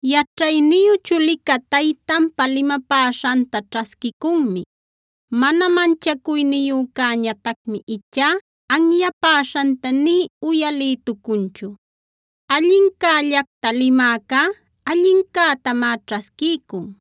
Yaćhayniyu chulica taytanpa limapäśhanta ćhasquicunmi; mana manchacuyniyücäñatacmi ichá anyapäśhanta nï uyalïtucunchu. Allincällacta limäcá allincätamá ćhasquiycun;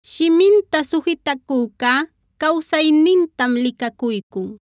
Shiminta sujitacücá cawsaynintam licacuycun;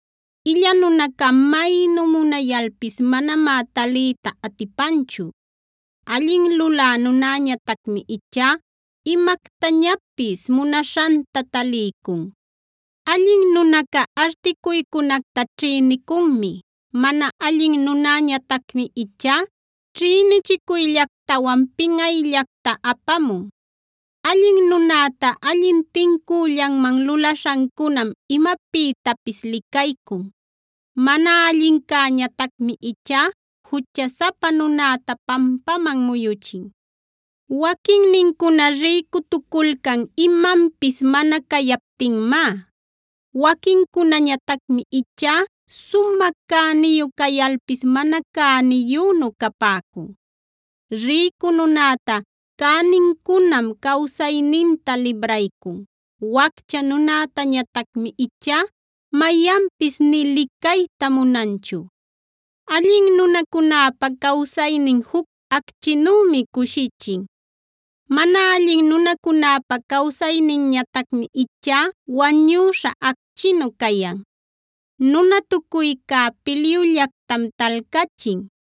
Illa nunaca maynu munayalpis manamá taliyta atipanchu; allin lulä nunäñatacmi ichá imactañapis munaśhanta taliycun. Allin nunaca articuycunacta ćhïnicunmi; mana allin nunäñatacmi ichá ćhïnichicuyllactawan pinꞌayllacta apamun. Allin nunäta allin tincüllanman lulaśhancunam imapïtapis licaycun; mana allincäñatacmi ichá juchasapa nunäta pampaman muyuchin. Waquincuna rïcutuculcan imanpis mana cayaptinmá; waquincunañatacmi ichá sumä cäniyu cayalpis mana cäniyünu capäcun. Rïcu nunäta cänincunam cawsayninta libraycun; waccha nunätañatacmi ichá mayanpis nï licayta munanchu. Allin nunacunäpa cawsaynin juc acchinümi cushichin; mana allin nunacunäpa cawsayninñatacmi ichá wañüśha acchinu cayan. Nunatucuycá pilyullactam talcachin;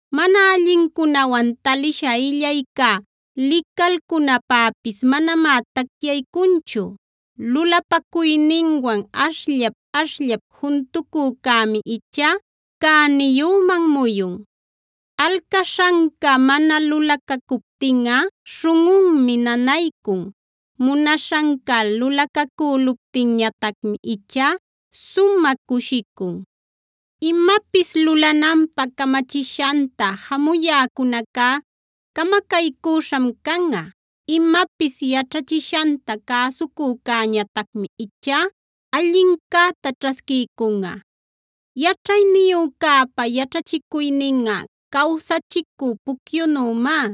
Mana allincunawan talisha illaycá licalcunapäpis manamá tacyanchu; lulapacuyninwan ashllap-ashllap juntucücämi ichá cäniyüman muyun. Alcaśhanca mana lulacacuptinꞌa śhunꞌunmi nanaycun; munaśhanca lulacacüluptinñatacmi ichá sumä cushicun. Imapis lulananpä camachishanta jamuyäcunacá camacaycüśham canꞌa; imapis yaćhachishanta cäsucücäñatacmi ichá allincäta ćhasquiycunꞌa. Yaćhayniyücäpa yaćhachicuyninꞌa cawsachicü pucyunümá,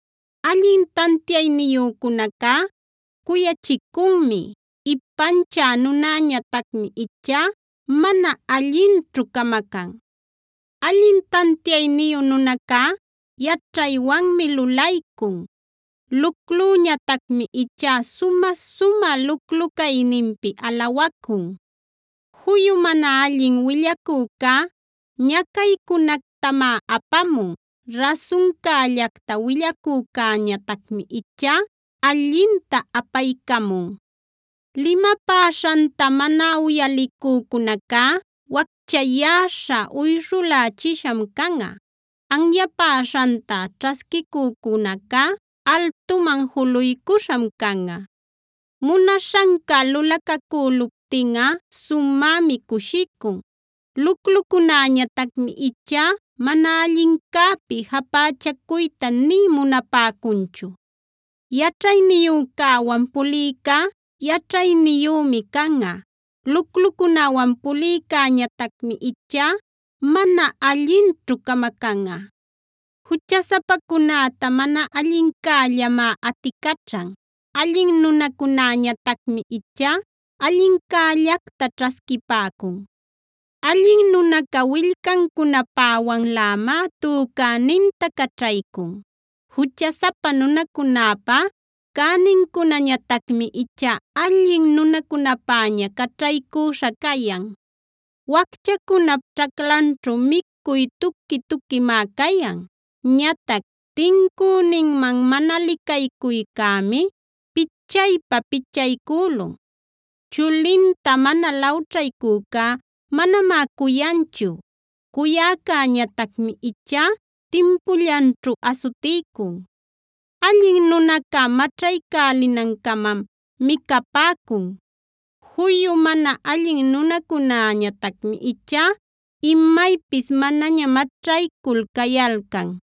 Allin tantiayniyücunacá cuyachicunmi; ipanchä nunäñatacmi ichá mana allinćhu camacan. Allin tantiayniyu nunacá yaćhaywanmi lulaycun; luclüñatacmi ichá sumä-sumä luclu-cayninpi alawacun. Juyu mana allin willacücá ñacaycunactamá apamun; rasuncällacta willacücäñatacmi ichá allinta apaycamun. Limapäśhanta mana uyalicücunacá wacchayäśha, uyshulächisham canꞌa; anyapäśhanta ćhasquicücunacá altuman juluycuśham canꞌa. Munaśhanca lulacacüluptinꞌa sumämi cushicun; luclucunäñatacmi ichá mana allincäpi japächacuyta nï munapäcunchu. Yaćhayniyücäwan pulïcá yaćhayniyümi canꞌa; luclucunäwan pulïcäñatacmi ichá mana allinćhu camacanꞌa. Juchasapacunäta mana allincällamá aticaćhan; allin nunacunäñatacmi ichá allincällacta ćhasquipäcun. Allin nunaca willcancunapäwanlämá tücäninta caćhaycun; juchasapa nunacunäpa cänincunañatacmi ichá allin nunacunapäña caćhaycüśha cayan. Wacchacunap ćhaclanćhu micuy tuqui-tuquimá cayan; ñatac tincüninman mana licaycuycämi pichaypa-pichaycülun. Chulinta mana lawćhaycücá manamá cuyanchu; cuyäcäñatacmi ichá timpullanćhu asutiycun. Allin nunaca maćhaycälinan-camam micapäcun; juyu mana allin nunacunäñatacmi ichá imaypis manaña maćhaycul cayalcan.